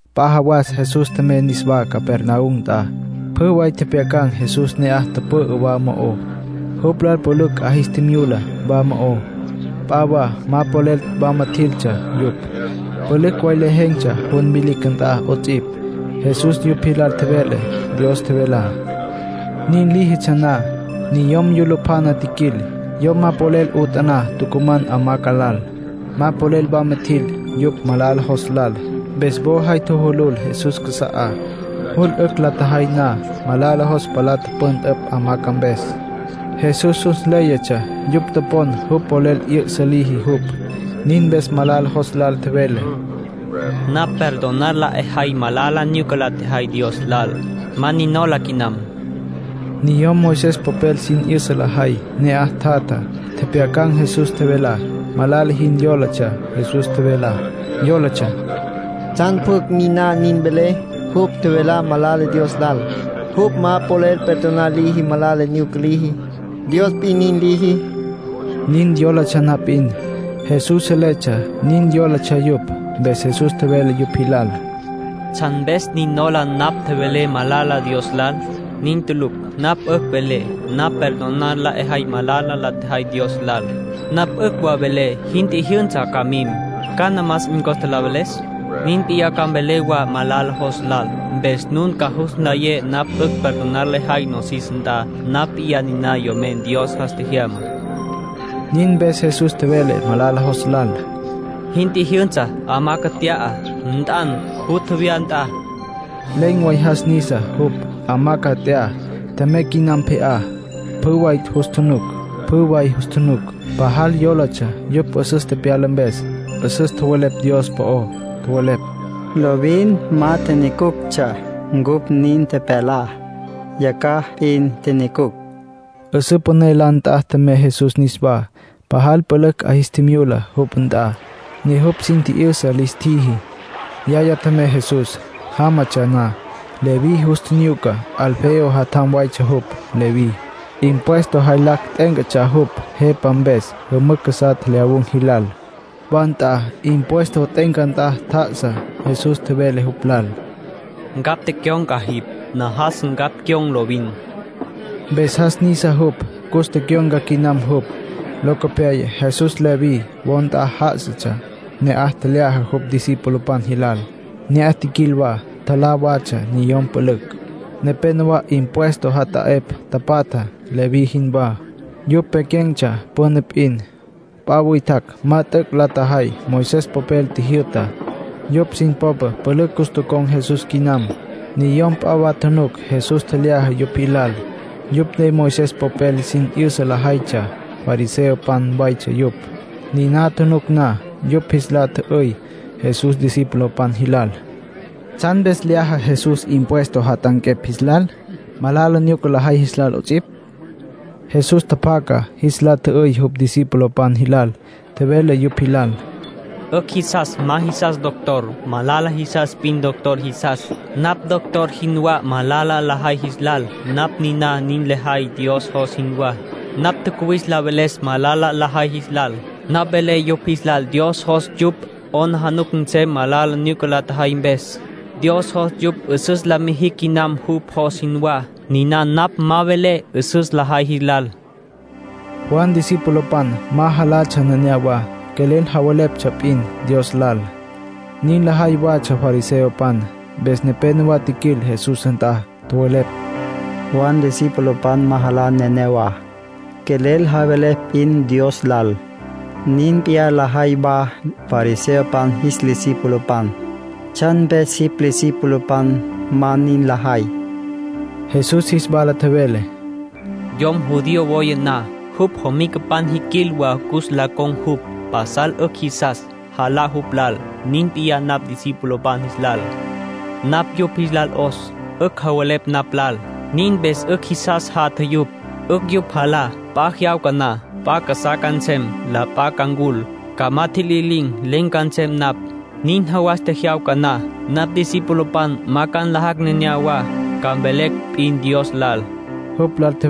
P'a jawas Jesús tjemey niswá Capernaum nt'a. Pjü way tjepjyacan̈ Jesús ne'aj tüpü'ü wa mo'ó. Jupj lal pülücj 'a jis tjimyula wa mo'ó. P'a wa ma polel wama jiltsja yupj. Pülücj way lejen̈tsja jun vilicj nt'a 'ots'ipj. Jesús yupj jilal tjevele Dios tjevelá. Nin líjitsja na, niyom yulupjana tjiquil. Yom ma polel 'utaná tucuman hamaca lal. Ma polel wama tjil yupj malala jos lal, mpes wo jay tjujulul Jesús casa'á. Jul 'ücj la tjajay na, malala jos palá tüpüntüpj hamaca mpes. Jesús jus nléyatsja yupj topon jupj polel 'yü'sa liji jupj. Nin mpes malala jos lal tjevele: —Napj perdonar la 'ejay malala nyuca la tjejay Dios lal. Ma nin nola quinam. Niyom Moisés popel sin 'yüsa lajay ne'aj tjatja, tjepjyacan̈ Jesús tjevelá. Malala jin yólatsja Jesús tjevelá. Yólatsja: “¿Tsjan pjucj niná nin vele? Jupj tjevelá malala Dios lal. Jupj ma polel perdonar liji malala nyuca liji. Dios p'in nin liji.” Nin yólatsja na p'in, Jesús seletsja nin yólatsja yupj. Mpes Jesús tjevele yupj jilal: —¿Tsjan mpes nin nujola napj tjevelé malala Dios lal? Nin tulucj. Napj 'ücj velé: ‘Napj perdonar la 'ejay malala la tjejay Dios lal’. Napj 'ücj wa velé: ‘Jin tjijyünsa, ca mim’. ¿Cana más 'in costa la veles? Nin p'iyá ca mvelé wa malala jos lal, mpes nun ca jus nlayé napj 'ücj perdonar lejay nosis nt'a. Napj p'iyá niná Yomen Dios jas tjejyamá —nin tjevele Jesús. Nin mpes Jesús tjevele malala jos lal: —Jin tjijyünsa. Hamaca nt'ya, nt'an, jutja wya nt'a. Len̈ way jas nisa jupj. Hamaca nt'ya. Tjemey quinam pje'á. Pjü way jus tjunuc. Pajal yólatsja yupj 'üsüs tepyala mpes. 'Üsüs tjowelepj Dios po'ó. Tjowelepj: —Lovin ma tjinyucuctsja cupj nin tepyalá. Yacjaj p'in tjinyucucj. 'Üsǘ püné la nt'a tjemey Jesús niswá. Pajal pülücj 'a jis tjimyula jupj nt'a, ne jupj sin tji'yüsa lis tjiji. Yacjaya tjemey Jesús. Jámatsja na, Leví jus tjinyuca. Alfeo jatjam waytsja jupj, Leví. Impuesto jaylacj t'e'éncatsja jupj jepa mpes jümücj casá tjelyawun̈ jilal. Wa nt'a impuesto t'e'enca nt'a tjá'asa. Jesús tjevele jupj lal: “Ncapj tecyon̈ca jipj. Najas ncapj cyon̈ lovin.” Mpes jas nisa jupj, cus tecyon̈ca quinam jupj. Locopyaya Jesús Leví wo nt'a já'asatsja. Ne'aj tjelyaja jupj discipulopan jilal. Ne'aj tjiquil wa, tjalá watsja niyom pülücj. Nepénowa impuesto jata'epj tapatja, Leví jinwá. Yupj pequen̈tsja püna p'in. P'a witjacj ma t'üc' la tjajay Moisés popel tjijyü'tá. Yupj sin popa pülücj cus tocon̈ Jesús quinam. Niyom p'a wa tjunuc Jesús tjelyaja yupj jilal. Yupj ne Moisés popel sin 'yüsa lajaytsja. Fariseopan waytsja yupj. Niná tjunuc na, yupj jis la tjü'üy Jesús discipulopan jilal: —¿Tsjan mpes lyaja Jesús impuesto jat'anquepj jis lal, malala nyuca lajay jilal 'ots'ipj? Jesús tjapjaca jis la tjü'üy jupj discipulopan jilal. Tjevele yupj jilal: —'Ücj jisas ma jisas doctor. Malala jisas p'in doctor jisas. Napj doctor jinwá malala lajay jis lal. Napj niná nin lejay Dios jos jinwá. Napj tjacuwis la veles malala lajay jis lal. Napj velé yupj jis lal Dios jos yupj 'aplijila nsem malala nyuca la tjajay mpes. Dios jos yupj 'üsüs la mijicj quinam jupj jos jinwá. Niná napj ma velé 'üsüs lajay jis lal —nin tjevele Jesús. Juan discipulopan ma jalatsja neneyawá; quelel javeleptsja p'in Dios lal. Nin lajay watsja fariseopan. Mpes nepénowa tjiquil Jesús nt'a, tjowelepj: —Juan discipulopan ma jalá neneyawá; quelel javelepj p'in Dios lal. Nin p'iyá lajay wa fariseopan jis discipulopan. ¿Tsjan mpes jipj discipulopan ma nin lajay? Jesús jis wala tjevele: —Yom judío woya na, jupj jomicapan jiquil wa cus la con̈ jupj. Pasal 'ücj jisas, jalá jupj lal. Nin p'iyá napj discipulopan jis lal. Napj yupj jis lal 'os. 'Ücj javelepj napj lal. Nin mpes 'ücj jisas jatja yupj. 'Ücj yupj jalá. P'a jyawca na, p'a casá ca nsem. La p'a ca ncul, ca ma tjililin̈. Len̈ ca nsem napj. Nin jawas tjejyawca na, napj discipulopan ma ca nlajacj neneyawá, ca mvelecj p'in Dios lal —nin tjevele Jesús.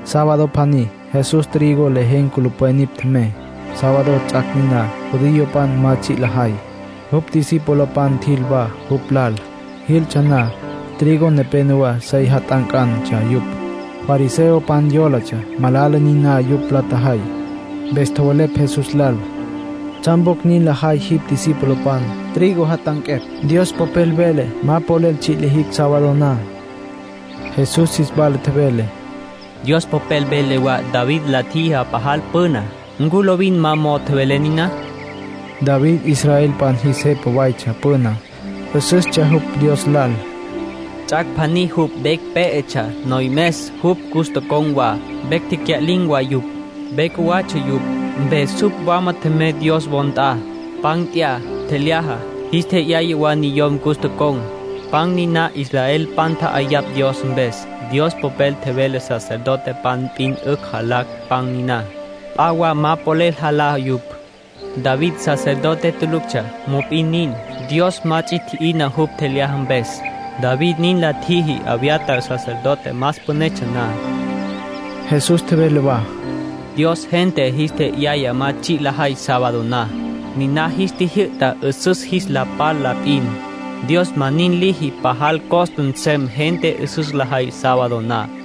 Sábado pjaní Jesús trigo lejen̈ culupwen nipj tjemey. Sábado ts'ac' niná judiopan ma tsji' lajay. Jupj discipulopan tjil wa jupj lal. Jiltsja na, trigo nepénowa sey jat'anqueptsja yupj. Fariseopan yólatsja malala niná yupj la tjajay. Mpes tjowelepj Jesús lal: —¿Tsjan pjucj nin lajay jipj discipulopan, trigo jat'anquepj? Dios Popel vele ma polel tsji' lijicj sábado na. Jesús jis wala tjevele: —Dios Popel vele wa David la tjijá pajal püna. ¿Ncu lovin ma mo'o tjowelé niná? (David israelpan jis jepa waytsja püná. 'Üsüstsja jupj Dios lal.) Ts'ac' pjaní jupj vecj pé'etsja. Noyomes jupj cus tocon̈ wa, vecj tecya'lin̈ wa yupj. Ve cjuwatsja yupj. Mpes jupj wama tjemey Dios wo nt'a. Pan nt'ya, tjelyaja. Jis tje'yaya wa niyom cus tocon̈. Pan niná israelpan tja'ayapj Dios mpes. Dios Popel tjevele sacerdotepan p'in 'ücj jalá pan niná. P'a wa ma polel jalá yupj. David sacerdote tuluctsja, mop'in nin, Dios ma ts'i tji'ina jupj tjelyaja mpes. David nin la tjiji Abiatar sacerdote más pünetsja na. Jesús tjevele wa: —Dios gente jis tje'yaya ma tsji' lajay sábado na. Niná jis tjijyü'ta 'üsüs jis la pal la p'in. Dios ma nin liji pajal costa nsem gente 'üsüs lajay sábado na.